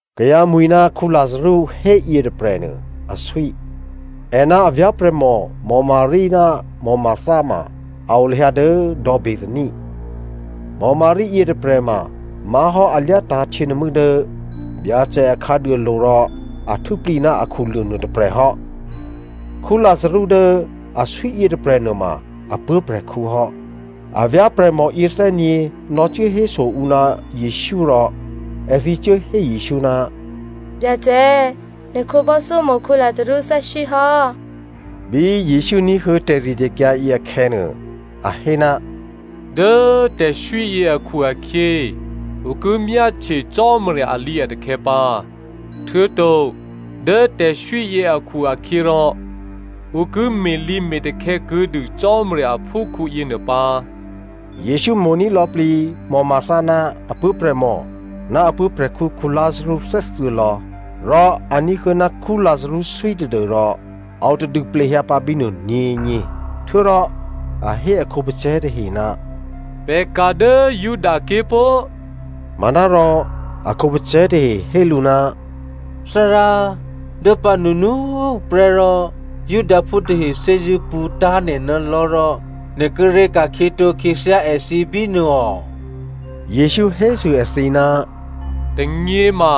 Kayǎmwi̤ ná Lazarú hé yětôprè̤nuô aswí. È ná a vyá̤prè̤mò Maria ná Martha ma a o lahyǎ dố dò̌ Bethania. Maria yětôprè̤ ma má̤hò́ a lyátǎ̤ htyěnuô̤mû́ dố Byacè a khǎduôlo̤ rò a htû́plǐ ná akhuluô̤ nuôtôprè̤ hò́. Lazarú dố aswí yětôprè̤ nuôma a puố̤prè̤khǔ hò́. A vyá̤prè̤mò yěthè́nyě̤ nò̌cuố héso ǔ ná Jesǔ, rò èthǐ cuố hé Jesǔ, “Byacè, nè̤ khǒbò́thyómo̤ Lazarú thè́swí hò́.” Bí Jesǔ ní̤huô̌ tè̤ritè̤kyǎ yě akhè̌nuô, a hé, “Dố tè̤swíyě akhu-akhyě ǔ ki myáhtye Cò́marya alǐ atakhè̌ pǎ. Htuô̌to dố tè̤swíyě akhu-akhyěrò ǔ ki me̤lǐme̤takhè̌ kuô̌dû Cò́marya aphúkhǔ yěnuô pǎ.” Jesǔ mo̤ní̤ lò̌plǐ Martha ná apuố̤prè̤mò, ná a puố̤prè̤khǔ Lazarú thè́thuô̌lò̌. Rò a ní̤huô̌ ná Lazarú swí tadû́rò a o tadû plehyǎpǎ bínuô nyě̤nyě. Htuô̌rò a hé a khǒpacè̤̌ tahe, “Pè̤ ka̤ dố Judaké̤ pó꤮.” Manárò a khǒpacè̤̌ tahe hé lǔ, “Thárá, dố pǎnunu꤮ huprè́ rò Judaphú tahe thè́zṳ̂́ pṳ̌ tá̤ nè̤ ná lò̤́ rò nè̤ kíré̤ ka̤khyětǒ khyěthyá èthǐ bínuô ò?” Jesǔ hésû èthǐ, “Tônyě ma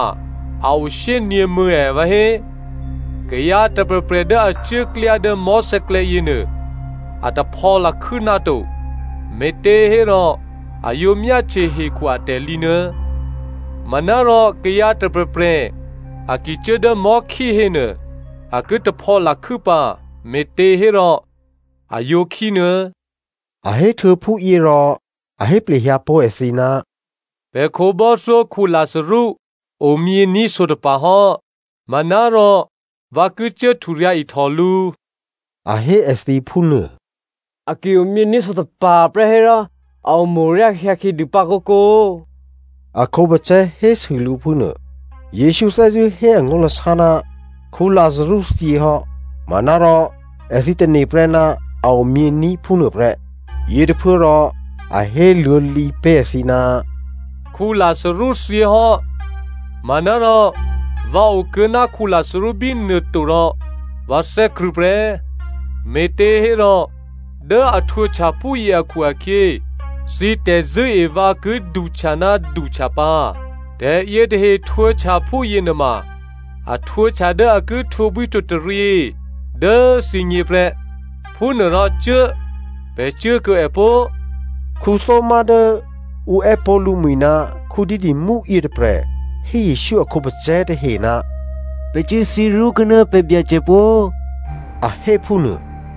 a o shyényě̤mû̌ ha vǎhé? Kayǎ tôprè̤prè̤ dố a cuốklyá dố mò̤́sè̌klè̌ yěnuô, a taphò̌ lakhû́ náto, me̤těhérò a yǒ myáhtye hekhu atè̤lǐ nuô̌. Manárò kayǎ tôprè̤prè̤ a ki cuố dố mò̤́khí hénuô, a ki taphò̌ lakhû́ pǎ, me̤těhérò a yǒ khí nuô̌.” A héhtuô̌ phúyě rò, a hé plehyǎ pó̤ èthǐ, “Pè̤ khǒbò́thyó Lazarú omyění̤ sǒtapa̤ hò́, manárò vǎ ki cuố hturyǎ̤ ihtò lǔ.” A hé èthǐ phúnuô. “A ki omyění̤ sǒtapa̤ prè́ hérò, a omo̤-oryá hyǎkhyě dû pǎ kǒkǒ,” a khǒpacè̤̌ hésû lǔ phúnuô. Jesǔ thè́zṳ̂́ hé angó̤lasá ná Lazarú thyě hò́ manárò èthǐ tane̤prè́ ná a omyění̤ phúnuôprè́. Yětôphuốrò a héluô̌lǐ pé̤ èthǐ, “Lazarú thyěhò́, manárò, vǎ okuô̌ ná Lazarú bínuô to rò vǎ thè́krṳ̂̌ prè́, me̤těhérò dố a htwǒhtya phúyě akhu-akhyě, thǐ tè̤zṳ̂́e vǎ ki duhtya ná duhtya pǎ. Tè̤yětahe htwǒhtya phúyě nuôma, a htwǒhtya dố a ki htwǒbwíhtwǒtaryě dố thǐgně prè́. Phúnuôrò cuố꤮, pè̤ cuốkuô̌ è pó꤮.” Thomazo dố ǔ è́pó̤ lǔmwi̤ ná Didymo yětôprè̤ hé Jesǔ a khǒpacè̤̌ tahe, “Pè̤ cuốthyě ró̤kuô̌ ná pè̤ Byacè pó!” A hé phúnuô.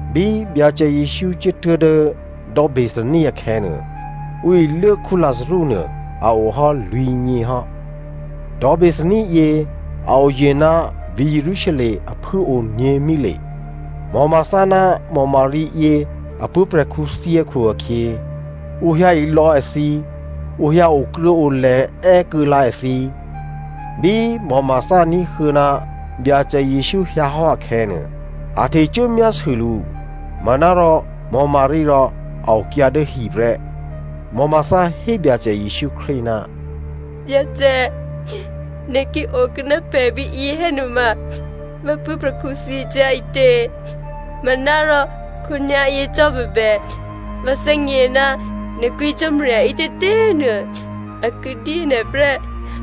Bí Byacè Jesǔ cuốtuố̤ dố dò̌ Bethania akhè̌nuô, ǔ iluố Lazarú nuô a ohò́ lwǐ̤nyě hò́. Dò̌ Bethania yě a oye̤ ná vǐ̤ Jerusalem a phû꤮ o nyě̤mile. Martha ná Maria yě a puố̤prè̤khǔ thyě akhu-akhyě, ǔ hyǎ ilò̌ èthǐ, ǔ hyǎ okruô̌olè̤ è́kuô̌ lǎ èthǐ. Bí Martha ní̤huô̌ ná Byacè Jesǔ hyǎhò́ akhè̌nuô, a htecuố myásû lǔ. Manárò, Maria rò a okyǎ dố hi prè́. Martha hé Byacè Jesǔ Krístu, “Byacè, nè̤ ki okuô̌ ná pè̤ bíyě hénuôma, vǎ puố̤prè̤khǔ thyě cyá̤ ǐtě. Manárò, khǒnyá̤yě cò́ bèbè, vǎ thè́gně ná nè̤ kwǐ Cò́marya ǐtětě꤮ nuô, a ki dyé nè̤ prè́.”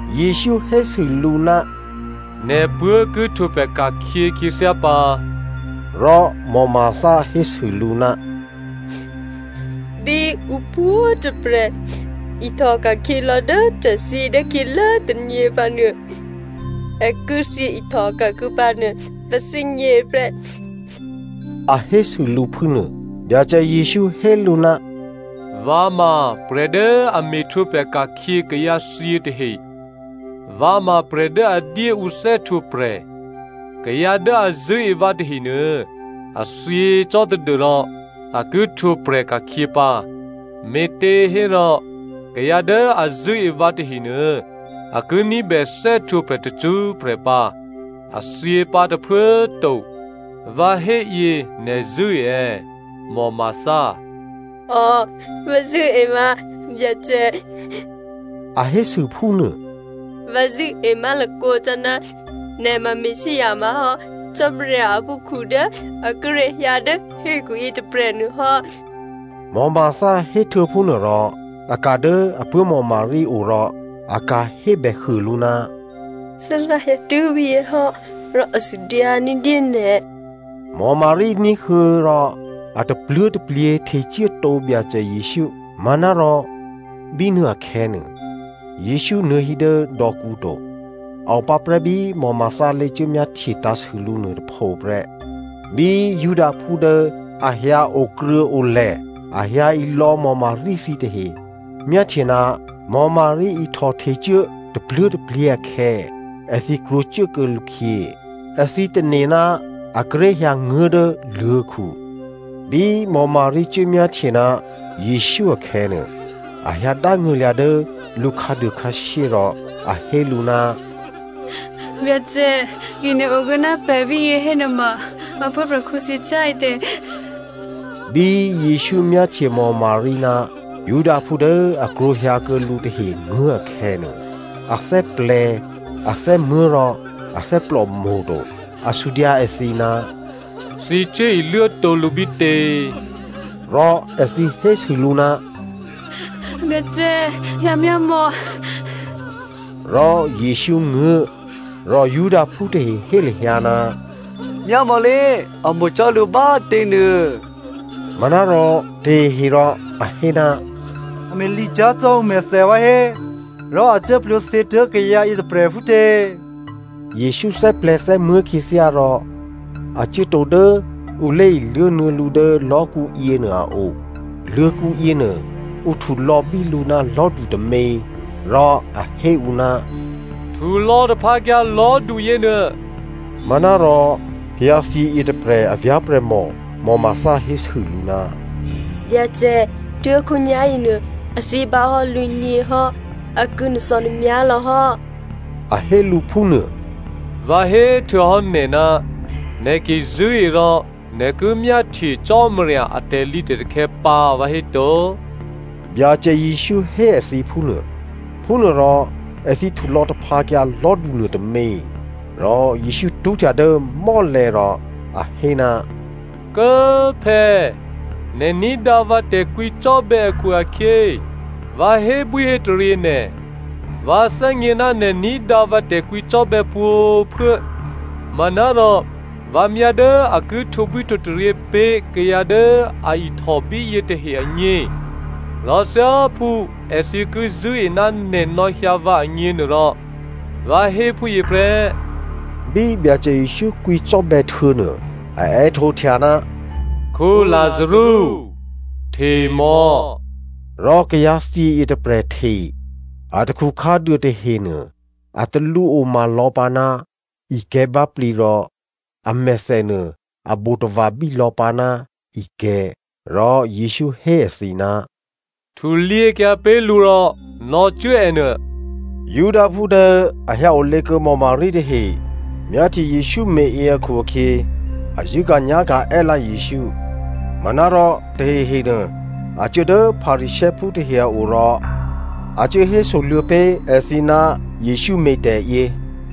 Jesǔ hésû lǔ, “Nè̤puố̤ ki htwǒprè̤ ka̤khyě khyěthyá pǎ.” Rò Martha hésû lǔ, “Bí ǔ pwǒ̤꤮ tôprè̤ ihtòka̤khyě lò̌ dố tè̤thyě dố khyělố tônyě pǎnuô, è ki thyěihtò ka̤kuô̌ pǎnuô vǎ thè́gně prè́,” a hésû lǔ phúnuô. Byacè Jesǔ hé lǔ, “Vǎ ma prè̤ dố a me̤htwǒprè̤ ka̤khyě kayǎthyě tahe. Vǎ ma prè̤ dố a dyé ǔ thè́htwǒprè̤. Kayǎ dố a zṳ̂́e vǎ tahenuô, a thyě cò́ tadû́rò a ki htwǒprè̤ ka̤khyě pǎ. Me̤těhérò kayǎ dố a zṳ̂́e vǎ tahenuô, a ki ní̤bè thè́htwǒprè̤ tacṳ́prè̤ pǎ, a thyěpǎ tôphuố꤮ to. Vǎ héyě nè̤ zṳ̂́e è̌, Martha?” “Ò, vǎ zṳ̂́e vǎ, Byacè,” a hésû phúnuô. “Vǎ zṳ̂́e má̤lakǒ cò́ ná nè̤ ma Messia má̤hò́ Cò́marya a phúprè̤khǔ dố a kíré̤ hyǎ dố hekhu yětôprè̤ nuôhò́.” Martha héhtuô̌ phúnuôrò a ka̤ dố apuố̤ Maria o rò a ka̤ hébèhuô lǔ, “Thárá hyǎtuố̤ bíyě hò́, rò a sudyǎ ní̤dyé nè̤.” Maria ní̤huô̌ rò a tapluố̤taplyě htecuốtǒ Byacè Jesǔ. Manárò bínuô akhè̌nuô, Jesǔ nuô̌hí dố dò̌kǔ to. A opǎprè́ bí Martha lé̤cuố myáhtye tǎ̤sû lǔ nuôtôpho prè́. Bí Judaphú dố a hyǎ okruô̌olè̤, a hyǎ ilò̌ Maria thǐtahe myáhtye ná Maria ihtò htecuố tapluố̤taplyě akhè̌, èthǐ krwǒcuốkuô̌ lǔkhyě. Èthǐ tane̤ ná a kíré̤ hyǎnguố̤ dố luô̤̌khu. Bí Maria cuốmyáhtye ná Jesǔ akhè̌nuô, a hyǎdángṳ̂lya̤ dố lǔkhǎduô khǎshyé rò a hé lǔ, “Byacè꤮ ki nè̤ okuô̌ ná pè̤ bíyě hénuôma, vǎ puố̤prè̤khǔ thyě cyá̤ ǐtě?” Bí Jesǔ myáhtye Maria ná Judaphú dố a krwǒ hyǎkuô̌ lǔ tahe nguố̤ akhè̌nuô, a thè́plè̤̌, a thè́muố̤ rò a thè́plòmo̤to. A sudyǎ èthǐ, “Thǐ cuố iluốtǒ lǔ bítě?” Rò èthǐ hésû lǔ, “Byacè, hyǎmyámò̌.” Rò Jesǔ nguố̤. Rò Judaphú tahe hé lahyǎ, “Myámò̌lé, a mo̤ cò́ lǔ bá꤮ těnuô.” Manárò tahehe rò a hé, “A me̤ lǐ cyá̤ cò́ ǔmèthè vǎ hé rò a cuố plwǒthyětuố̤ kayǎ yětôprè̤ phútě?” Jesǔ thè́plè̤̌ thè́muố̤ khyěthyá rò a cuốtǒ dố ǔ lé̤iluố nuô̌ lǔ dố lò̤́kǔ yěnuô a o. Luô̤̌kǔ yěnuô ǔ htulò̌bí lǔ ná lò̤́du tômě. Rò a hé ǔ, “Htulò̌ taphǎkyǎ lò̤́du yěnuô.” Manárò kayǎthyě yětôprè̤ a vyá̤prè̤mò Martha hésû lǔ, “Byacè, tuố̤khǒnyá̤ yěnuô, a thyě bǎhò́ lwǐ̤nyěhò́. A ki nuô̤thò̌nuô̤myá̤ lò̌hò́,” a hé lǔ phúnuô. “Vǎ héhtuô̌hò́ nè̤, nè̤ ki zṳ̂́e rò nè̤ ki myáhtye Cò́marya a tè̤lǐtè̤takhè̌ pǎ, vǎhéto?” Byacè Jesǔ hé èthǐ phúnuô. Phúnuôrò èthǐ htulò̌ taphǎkyǎ lò̤́du nuôtômě. Rò Jesǔ tṳ́htya dố mò́lè̤̌ rò a hé, “Kố꤮ Phè̌, nè̤ ní̤dǎ vǎ tè̤kwǐcò́bè̌ akhu-akhyě, vǎ hébwíhétaryě nè̤. Vǎ thè́gně ná nè̤ ní̤dǎ vǎ tè̤kwǐcò́bè̌ pwǒ̤꤮ phuố. Manárò vǎ myá dố a ki htwǒbwí htwǒtaryě pé̤ kayǎ dố a ihtò bíyě tahe agně, rò thyáphú èthǐ ki zṳ̂́e ná nè̤ nò̌hyǎ vǎ agněnuôrò, vǎ hé phúyě prè́.” Bí Byacè Jesǔ kwǐcò́bè̌ htuô̌nuô, a è́htǒhtya, “Lazarú! Htemò̌!” Rò kayǎ thyě yětôprè̤ hte. Atakhu khǎduô tahenuô a talǔoma lò̌pǎ ná ikè̤̌ báplǐ rò amèthè nuô a bo tava̤bí lò̌pǎ ná ikè̤̌. Rò Jesǔ hé èthǐ, “Htulyěkyǎ pé̤ lǔ rò nò̌cuố è nuô.” Judaphú dố a hyǎ olě kuô̌ Maria tahe myáhtye Jesǔ me̤yě akhu-akhyě a zṳ̂́ka̤nyá̤ka̤ è́lǎ Jesǔ. Manárò tahehe nuô a cuố dố Pharisěophú tahe a o rò a cuố hésoluô̌ pé̤ èthǐ ná Jesǔ me̤tè̤yě.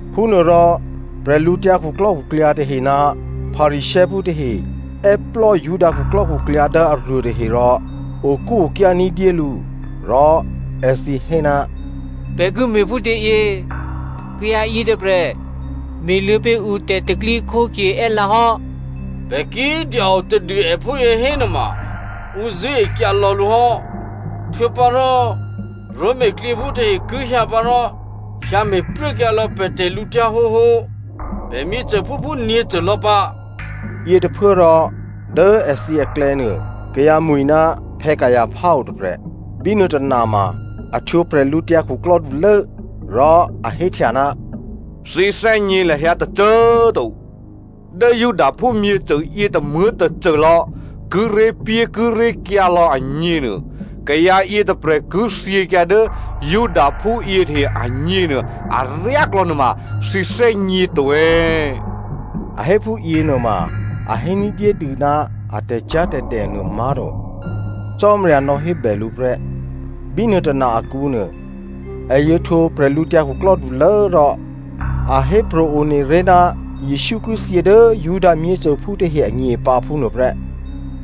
Phúnuôrò bwídukhu tahe ná Pharisěophú tahe è́plò́ Judaphú khuklò́khuklyǎ dố aruô tahe rò okúokyá ní̤dyé lǔ. Rò èthǐ hé, “Pè̤ ki me̤phútě yě? Kayǎ yětôprè̤ me̤luô̌ pé̤ ǔ tè̤pro̤tè̤prya̤ è́lǎ hò́. Pè̤ ki dya-o tadû è phúyě hénuôma, ǔ zṳ̂́e kuô̌lò̌ lǔ hò́. Htuô̌pǎrò Roma klyěphú tahe ki hyǎ pǎ rò hyǎ me̤pruốkyǎ lò̌ pè̤ tè̤lǔhǒduhǒ, pè̤ myěcôphúphú nyě̤côlò̌ pǎ.” Yětôphuốrò dố èthǐ aklè̌ nuô, kayǎmwi̤ ná Caipha otôprè̤. Bínuô tôna ma a htwǒ bwídukhulố. Rò a héhtya, “Thǐ thè́gně lahyǎ tôcô꤮ to. Dố Judaphú myěcô yětômuố̤ tôcôlò̌ kíré̤pyékíré̤kyǎ lò̌ agněnuô, kayǎ yětôprè̤ ki thyěkyǎ dố Judaphú yětahe agně nuô aryáklò̌ nuôma, thǐ thè́gněto è̌?” A hé phúyě nuôma a hé ní̤dyédû ná a tè̤cyá̤tè̤dè nuômá̤to. Cò́marya nò̌hébè lǔ prè́. Bínuô tôna akǔnuô, è yǒ htwǒ bwídukhulố rò a hépro̤ one ré̤ ná Jesǔ ki thyě dố Juda myěcôphú tahe agně pǎ, phúnuôprè́.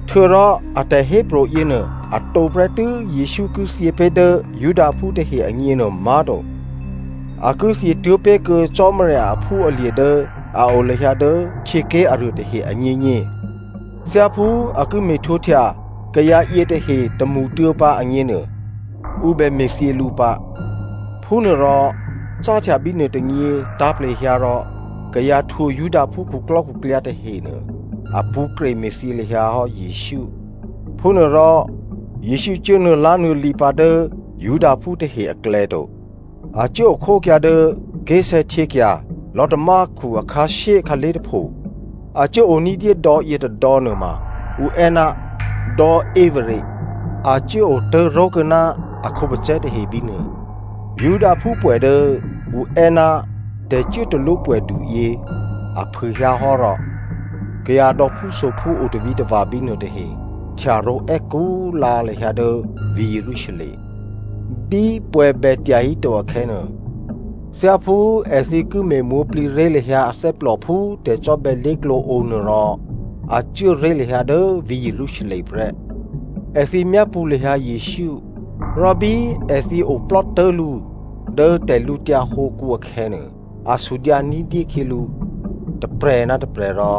Htuô̌rò a tè̤hépro̤ yěnuô, a tǒprè́tû́ Jesǔ ki thyě pé̤ dố Judaphú tahe agně nuômá̤to, a ki thyětuố̤ pé̤kuô̌ Cò́marya aphúalye̤ dố a o lahyǎ dố htyěké̤ aruô tahe agněgně. Thyáphú a ki me̤htwǒhtya kayǎ yětahe tômṳtuô̌ pǎ agněnuô, ǔ bè me̤thyě lǔ pǎ. Phúnuôrò, cáhtya bínuô tônyě tǎ̤plehyǎ rò kayǎ htwǒ Judaphú khuklò́khuklyǎ tahenuô, a pṳ̌ kreme̤thyě lahyǎ hò́ Jesǔ. Phúnuôrò, Jesǔ cuố nuô̌lá̤nuô̌lǐ pǎ dố Judaphú tahe aklè̌ to. A cuố okhókyǎ dố ké̤sè̌htyěkya̤ lò̤́tamákhu akhǎshyé khǎlé̤ tôpho. A cuố o ní̤dyé dò̌ yětôdò̌ nuôma ǔ è́ ná dò̌ Ephraim, a cuố otố̤ró̤ kuô̌ ná a khǒpacè̤̌ tahe bínuô. Judaphú pwè̌ dố ǔ è́ ná tè̤cuốtalwó pwè̌duyě a phûhyǎhò́ rò, kayǎ dò̌phúsophú otavǐtava̤ bínuô tahe htyaró̤ è́kú꤮ lǎ lahyǎ dố vǐ̤ Jerusalem. Bí pwè̌ bètyahíto akhè̌nuô, thyáphú èthǐ ki me̤ mwǒ̤plǐré̤ lahyǎ athè́plò phú tè̤cò́bè̌ lé̤klǒ o nuô rò a cuố ré̤ lahyǎ dố vǐ̤ Jerusalem prè́. Èthǐ myápṳ̌ lahyǎ Jesǔ. Rò bí èthǐ oplò́ tố̤lǔ dố tè̤lǔtyǎ hǒkǔ akhè̌nuô, a sudyǎ ní̤dyé khyělǔ tôprè̤ ná tôprè̤ rò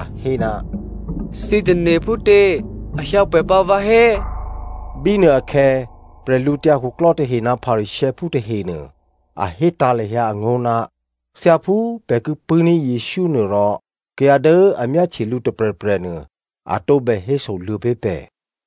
a hé, “Thǐ tane̤ phútě? A hyǎ pwè̌ pǎ vǎhé?” Bínuôakhè̌ prè̤lǔtyǎ khuklò́ tahe ná Pharisěophú tahenuô a hétǎ̤ lahyǎ angó̤, thyáphú pè̤ ki pṳ̂́ní̤ Jesǔ nuô rò, kayǎ dố a myáhtye lǔ tôprè̤prè̤ nuô, a tǒbè hésoluô̌ pé̤ pè̤.